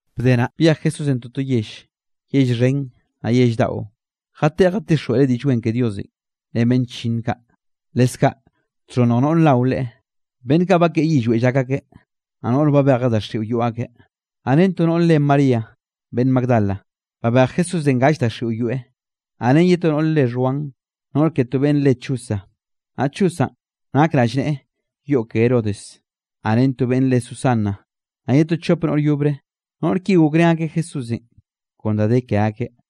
Bde naꞌ, byej Jesúsenꞌ toto yell, yell xhen, naꞌ yell daꞌo, jateꞌe jatixjweꞌreꞌ Diꞌll Wen ke Diosenꞌ ren beꞌnn chllinn kaꞌ. Leskaꞌ txhonnj noꞌr nao Leꞌe, beꞌnn kaꞌ bakeꞌe yillweꞌ llak akeꞌ, naꞌ noꞌr babejeꞌ daxiꞌo yoꞌ akeꞌ. Naꞌ ren to noꞌr re María beꞌnn Magdala, babej Jesúsenꞌ gall daxiꞌo yoeꞌ. Naꞌ ren ye to noꞌr re Xhuan, noꞌr ke to beꞌnn re Chuza, naꞌ Chuzanꞌ nak rallneꞌe yoꞌ ke Herodes, naꞌ ren to beꞌnn re Susana, naꞌ ye to chop noꞌr yobre. Noꞌr ki gokrén akeꞌ Jesúsenꞌ kon da de ke akeꞌ.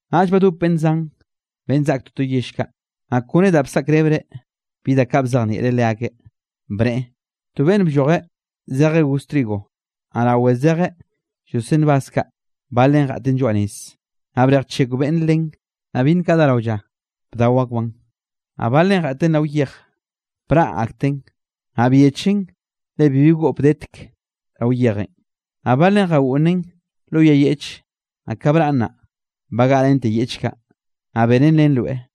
Naꞌll badop beꞌnn zan, beꞌnn zak toto yell kaꞌ, naꞌ kone da bsaꞌkrebreꞌ bi da kaꞌ bzejnieꞌreꞌ leakeꞌ, bneꞌe: —To beꞌnn bllojeꞌ zejeꞌ goz trigo, naꞌ rawe zejeꞌ lloseꞌ nbaz kaꞌ, balen jeꞌten lloaꞌ nez, naꞌ brejchekw beꞌnn len, naꞌ byinn kaꞌ dá rao lla, bdao akbaꞌn. Naꞌ balen jeꞌten rao yej, braꞌ akten, naꞌ byechen le bibi goꞌp detek rao yejenꞌ. Naꞌ balen jagoꞌnnen lo yay yeꞌche; naꞌ ka braꞌn naꞌ, bagaꞌrente yeꞌch kaꞌ, naꞌ benen len roe.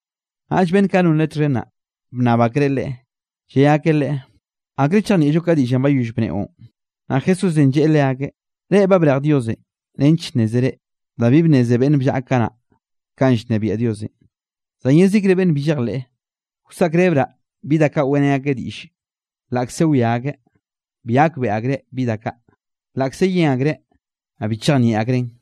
Naꞌll beꞌnn kaꞌ non Leꞌe txhen naꞌ, bnnab akreꞌ Leꞌe, lle akeꞌ Leꞌe: —¿Akre chejnieꞌllo ka diꞌllenꞌ bayoll bneꞌon? Naꞌ Jesúsenꞌ lleꞌe leakeꞌ: —Reꞌ, ba brej Diosenꞌ nench nnézere da bi bnneze beꞌnn bllaꞌa kanaꞌ, kanꞌ llnebiaꞌ Diosenꞌ, zan yezikre beꞌnn bi llejleꞌ, wsaꞌkrebraꞌ bi da kaꞌ weꞌrén akeꞌ diꞌlle. Laꞌkze wia akeꞌ, bi gakbeꞌe akreꞌ bi da kaꞌ; laꞌkze yen akreꞌ, naꞌ bi chejnieꞌ akreꞌn.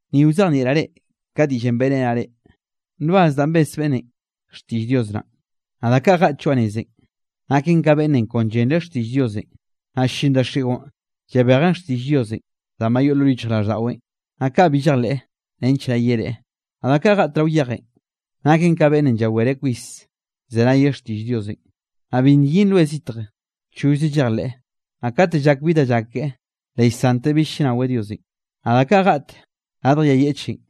’Ni wzejnieꞌraꞌ reꞌ ka diꞌllenꞌ beꞌrenaꞌ reꞌ: nbaz danꞌ bes beꞌnnenꞌ, xtiꞌll Dios naꞌn. Naꞌ da kaꞌ jeꞌt lloaꞌ nezenꞌ, naken ka beꞌnnenꞌ kon llenreꞌ xtiꞌll Diosenꞌ; naꞌll ll-llin daxiꞌon llabejen xtiꞌll Diosenꞌ danꞌ ba yoꞌ lo yichjraꞌlldaꞌweꞌn, naꞌ kaꞌ bi llejleꞌ nench naꞌ yereꞌe. Naꞌ da kaꞌ jeꞌt rao yejenꞌ, naken ka beꞌnnenꞌ llawereꞌ kwis llzenayeꞌ xtiꞌll Diosenꞌ; naꞌ bi nyin roe zitj, chollze llejleꞌ, naꞌ kate llak bi da llak keꞌe, le llsanteꞌ bill llnaweꞌ Diosenꞌ. Naꞌ da kaꞌ jeꞌt radj yay yeꞌchenꞌ,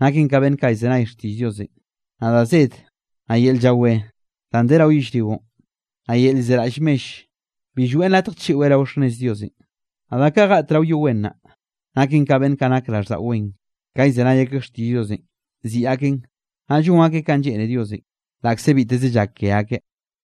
naken ka beꞌnn kaꞌ llzenay xtiꞌll Diosenꞌ, naꞌ da zed, naꞌ yel llawé danꞌ de rao yellrionꞌ, naꞌ yel llzeraꞌll mell, bi lloeꞌn latj chiꞌweꞌ rao xhnnez Diosenꞌ. Naꞌ da kaꞌ jeꞌt rao yo wen naꞌ, naken ka beꞌnn kaꞌ nak raꞌlldaꞌo wen; ka llzenay akeꞌ xtiꞌll Diosenꞌ, ziꞌi akeꞌn, naꞌ llon akeꞌ kanꞌ lleꞌne Diosenꞌ, laꞌkze biteze llak ke akeꞌ.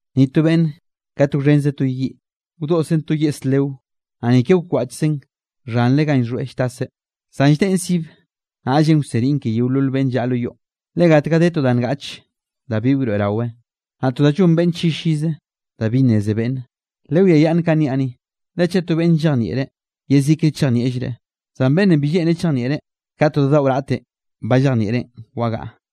’Ni to beꞌnne kate wxhenzeꞌ to yiꞌ, wdoꞌszeꞌn to yeꞌs leo, naꞌ ni ke wkwaꞌchzeꞌn xhanre ganꞌ llxhoeꞌ lltaseꞌ, zan lldeꞌen sibe, naꞌllenꞌ wseniꞌn ke yeolol beꞌnn llaꞌa lo yoꞌn. Le gatga de to da ngaꞌche da bi wroeꞌrawe, naꞌ to da llon beꞌnn llillize da bi nneze beꞌnne. ’Lewiayaꞌnn kanꞌ niaꞌ ni, le chaꞌ to beꞌnn llejnieꞌreꞌ, yezikre chejnieꞌllreꞌ; zan beꞌnnenꞌ bi lleꞌnreꞌ chejnieꞌreꞌ, ka to da daꞌo raꞌtenꞌ ba llejnieꞌreꞌn wagaꞌa.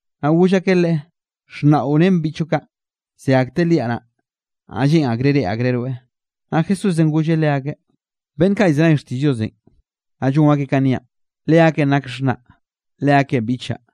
Naꞌ goll akeꞌ Leꞌe: —Xhnaꞌo ren beꞌnn biꞌchoꞌ kaꞌ, ze akteꞌ liaꞌ naꞌ, naꞌ lleꞌn akreꞌ reꞌe akreꞌ rweꞌ. Naꞌ Jesúsenꞌ golleꞌ leakeꞌ: —Beꞌnn kaꞌ llzenay xtiꞌll Diosenꞌ, naꞌ llon akeꞌ kanꞌ niaꞌn, leakeꞌn nak xhnaꞌ, leakeꞌn biꞌchaꞌ.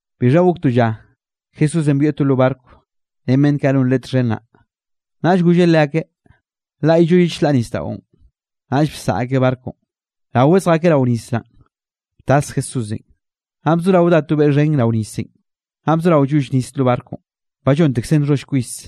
Bixha gok to lla Jesúsenꞌ byoeꞌ to lo barco, ren beꞌnn kaꞌ non Leꞌe txhen naꞌ, naꞌll golleꞌ leakeꞌ: —Laꞌyllo ye chlaꞌre nisdaꞌon. Naꞌll bsaꞌa akeꞌ barconꞌ. Rawe zjakeꞌ rao nis naꞌn, btas Jesúsenꞌ. Naꞌ bzorao dá to beꞌ xhen rao nisenꞌ, naꞌ bzorao lloll nis lo barconꞌ, ba llontekzen nxholl kwis.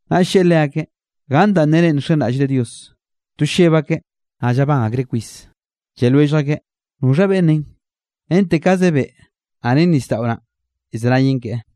Naꞌll lleꞌe leakeꞌ: —¿Ganꞌ danꞌ nere nxenraꞌllre Dios? To lleb akeꞌ, naꞌ llabán akreꞌ kwis, lle lwellj akeꞌ: —¿Noxha beꞌnnenꞌ? Rente kaze beꞌ, naꞌ ren nisdaꞌo naꞌ llzenayen keꞌe.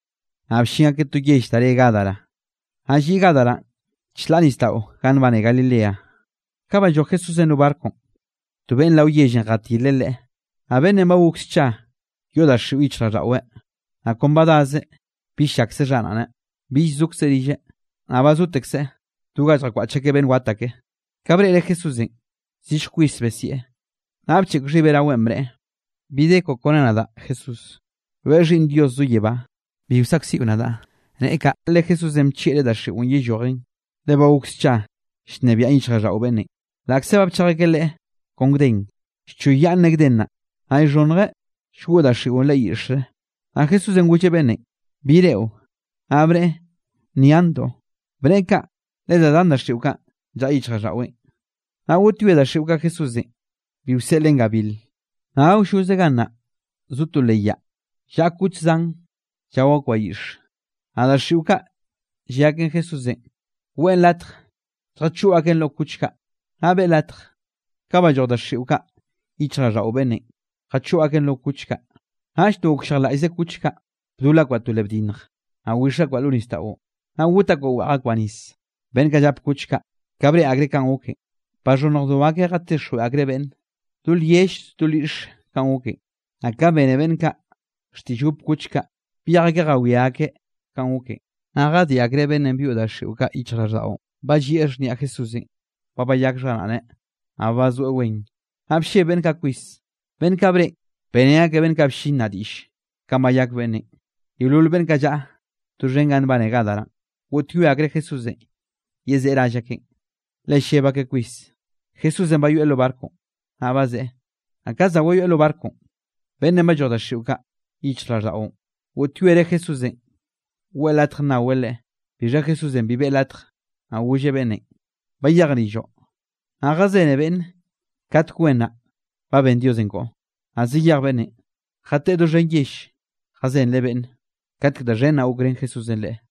Naꞌ bllin akeꞌ to yell da re Gadara, naꞌ lliꞌ Gadaranꞌ chlaꞌ nisdaꞌo ganꞌ nbane Galilea. Ka balloj Jesúsenꞌ lo barconꞌ, to beꞌnn rao yellenꞌ jatileꞌ Leꞌe, naꞌ beꞌnnenꞌ ba gok scha yoꞌ daxiꞌo yichjraꞌlldaꞌweꞌ. Naꞌ kon ba dazeꞌ bill llakze xharaꞌneꞌ; bill llzokzeꞌ rilleꞌ, naꞌ ba zotekzeꞌ do ganꞌ lljakwaꞌch akeꞌ beꞌnn wat ake. Ka breꞌreꞌ Jesúsenꞌ, zillj kwis besieꞌ; naꞌ bcheꞌk xhibeꞌ raweꞌn bneꞌe: —¿Bi de koꞌo kone nadaꞌ, Jesús? Rweꞌ Xhiꞌnn Dios zo yebá. Bi wsaꞌkziꞌo nadaꞌ. Neꞌe kaꞌ le Jesúsenꞌ llchieꞌreꞌ daxiꞌon yellojen, le ba gok scha llnebiaꞌn yichjraꞌlldaꞌo beꞌnnenꞌ. Laꞌkze ba bchej akeꞌ leꞌe kon gden, llchoyyaꞌnneꞌ gden naꞌ, naꞌ llxhonnjeꞌ llgoꞌ daxiꞌon leꞌe yiꞌxre. Naꞌ Jesúsenꞌ golleꞌ beꞌnnenꞌ: —¿Bi reꞌo? Naꞌ bneꞌe: —Nyantoꞌ. Bneꞌe kaꞌ le da zan daxiꞌo kaꞌn llaꞌa yichjraꞌlldaꞌweꞌn. Naꞌ goꞌtyoe daxiꞌo kaꞌ Jesúsenꞌ, bi wseꞌleꞌn gabil. Naꞌ awlloze gannaꞌ zo to leꞌ yaꞌ, llaꞌa kuch zan llao akbaꞌ yiꞌxe, naꞌ daxiꞌo kaꞌ, lle aken Jesúsenꞌ weꞌe latj lljachoꞌ aken lo kuch kaꞌ, naꞌ beꞌe latj. Ka balloj daxiꞌo kaꞌ yichjraꞌlldaꞌo beꞌnnenꞌ, jachoꞌ aken lo kuch kaꞌ. Naꞌll to gokllejlaꞌllze kuch kaꞌ, bdol akbaꞌ to leꞌ bdinnj, naꞌ wix akbaꞌ lo nisdaꞌon, naꞌ got akbaꞌ weꞌj akbaꞌ nis. Beꞌnn kaꞌ llap kuch kaꞌ, ka breꞌe akreꞌ kanꞌ goken, baxhonnjdo akeꞌ jatixjweꞌ akreꞌ beꞌnn, do lyell do lyiꞌxe kanꞌ goken. Naꞌ ka bene beꞌnn kaꞌ xtiꞌll gop kuch kaꞌ, byej akeꞌ jawiá akeꞌ kanꞌ goken. Naꞌ jadiꞌ akreꞌ beꞌnnenꞌ byoꞌ daxiꞌo kaꞌ yichjraꞌlldaꞌon, ba llieꞌ xhniaꞌ Jesúsenꞌ ba bayak xharaꞌneꞌ, naꞌ ba bazoeꞌ wen. Naꞌ blleb beꞌnn kaꞌ kwis. Beꞌnn kaꞌ breꞌen, beꞌrén akeꞌ beꞌnn kaꞌ bllin naꞌ diꞌll, kanꞌ bayak beꞌnnenꞌ. Yeolol beꞌnn kaꞌ llaꞌa doxhen ganꞌ nbane Gadaranꞌ, goꞌtyoe akreꞌ Jesúsenꞌ yezeꞌe rall akeꞌn, le lleb akeꞌ kwis. Jesúsenꞌ bayoeꞌ lo barconꞌ, naꞌ bazeꞌe. Naꞌ ka za wayoeꞌ lo barconꞌ, beꞌnnenꞌ balloj daxiꞌo kaꞌ yichjraꞌlldaꞌon, goꞌtyoereꞌ Jesúsenꞌ weꞌe latj nnaweꞌ Leꞌe. Bixha Jesúsenꞌ bi beꞌe latj, naꞌ golleꞌ beꞌnnenꞌ: —Bayej rilloꞌ, naꞌ jazene beꞌnne katek wen naꞌ ba ben Diosenꞌ koꞌo. Naꞌ zayej beꞌnnenꞌ, jateꞌe doxhen yell jazenreꞌ beꞌnne, katek da xhen naꞌ gokrén Jesúsenꞌ leꞌe.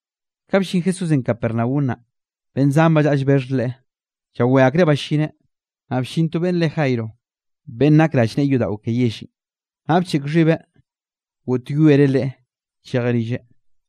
Ka ballín Jesúsenꞌ Capernaum naꞌ, beꞌnn zan ba llaꞌa llbexh Leꞌe, llawé akreꞌ ballineꞌ. Naꞌ bllin to beꞌnn re Jairo, beꞌnn nak rallneꞌe yodaꞌo ke yellenꞌ, naꞌ bcheꞌk xhibeꞌ goꞌtyoereꞌ Leꞌe chejeꞌ rilleꞌ,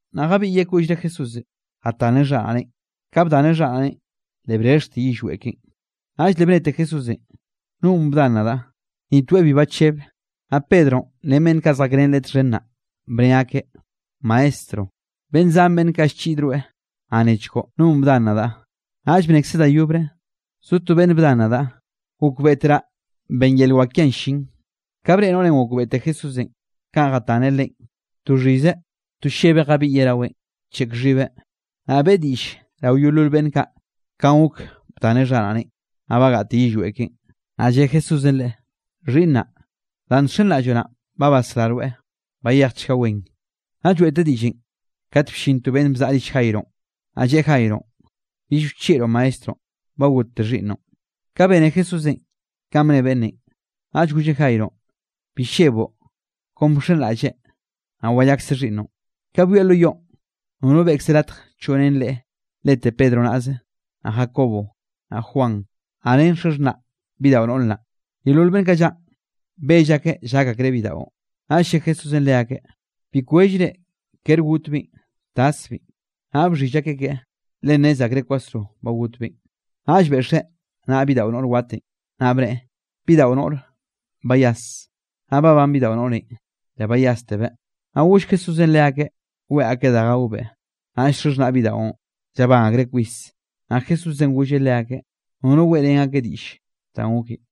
Naꞌ jabiꞌyeꞌ koꞌllre Jesúsenꞌ jataneꞌ xharaꞌneꞌn. Ka bdaneꞌ xharaꞌneꞌn, le brexhte yillweꞌ keꞌen. Naꞌll le bnete Jesúsenꞌ: —¿Nonꞌ bdan nadaꞌ? Ni toeꞌ bi bachebeꞌ, naꞌll Pedronꞌ ren beꞌnn kaꞌ zjakrén leꞌe txhen naꞌ, bne akeꞌ: —Maestro, beꞌnn zan beꞌnn kaꞌ llchiꞌd rweꞌ, naꞌ nechkoꞌ: “¿No bdan nadaꞌ?” Naꞌll bnekzeꞌ da yobre: —Zo to beꞌnn bdan nadaꞌ; gokbeꞌteraꞌ ben yel wak kiaꞌn llin. Ka breꞌe noꞌrenꞌ gokbeꞌte Jesúsenꞌ kanꞌ jataneꞌ Leꞌen, to xhizeꞌ, to llebeꞌ jabiꞌyeꞌ raweꞌn, bcheꞌk xhibeꞌ, naꞌ beꞌe diꞌll rao yeolol beꞌnn kaꞌ kanꞌ gok bdaneꞌ xharaꞌneꞌn, naꞌ bagaꞌte yillweꞌ keꞌen. Naꞌ lle Jesúsenꞌ leꞌe: —Xhiꞌnnaꞌ, danꞌ nxenraꞌlloꞌ naꞌn, ba basrá rweꞌ. Bayejchga wen. Naꞌ lloeꞌteꞌ diꞌllenꞌ, kate bllin to beꞌnn bzaꞌa rill Jaironꞌ, naꞌ lleꞌe Jaironꞌ: —Bill wchieꞌroꞌ Maestronꞌ, ba gotte xhiꞌnnoꞌn. Ka bene Jesúsenꞌ kanꞌ bne beꞌnnenꞌ, naꞌll golleꞌ Jaironꞌ: —Bi lleboꞌ, kon bxenraꞌlle, naꞌ wayakse xhiꞌnnoꞌn. Ka byoeꞌ lo yoꞌn, nono beꞌkzeꞌ latj choꞌ ren Leꞌe lete Pedro naꞌze, naꞌ Jacobo, naꞌ Juan, naꞌ ren xaxhnaꞌ bidaꞌo noꞌr naꞌ. Yeolol beꞌnn kaꞌ llaꞌn, bell akeꞌ llak akreꞌ bidaꞌon, naꞌll lle Jesúsenꞌ leakeꞌ: —Bi kwellre, kere gotbeꞌn, taszbeꞌn. Naꞌ bxhill akeꞌ keꞌe, le nnez akreꞌ kwasro ba gotbeꞌn. Naꞌll beꞌxeꞌ naꞌa bidaꞌo noꞌr watenꞌ, naꞌ bneꞌe: —Bidaꞌo noꞌre, bayas. Naꞌ babán bidaꞌo noꞌrenꞌ, le bayástebeꞌ, naꞌ goll Jesúsenꞌ leakeꞌ, weꞌe akeꞌ da gaobeꞌ. Naꞌll xaxhnaꞌ bidaꞌon llabán akreꞌ kwis, naꞌ Jesúsenꞌ golleꞌ leakeꞌ nono weꞌrén akeꞌ diꞌll danꞌ goken.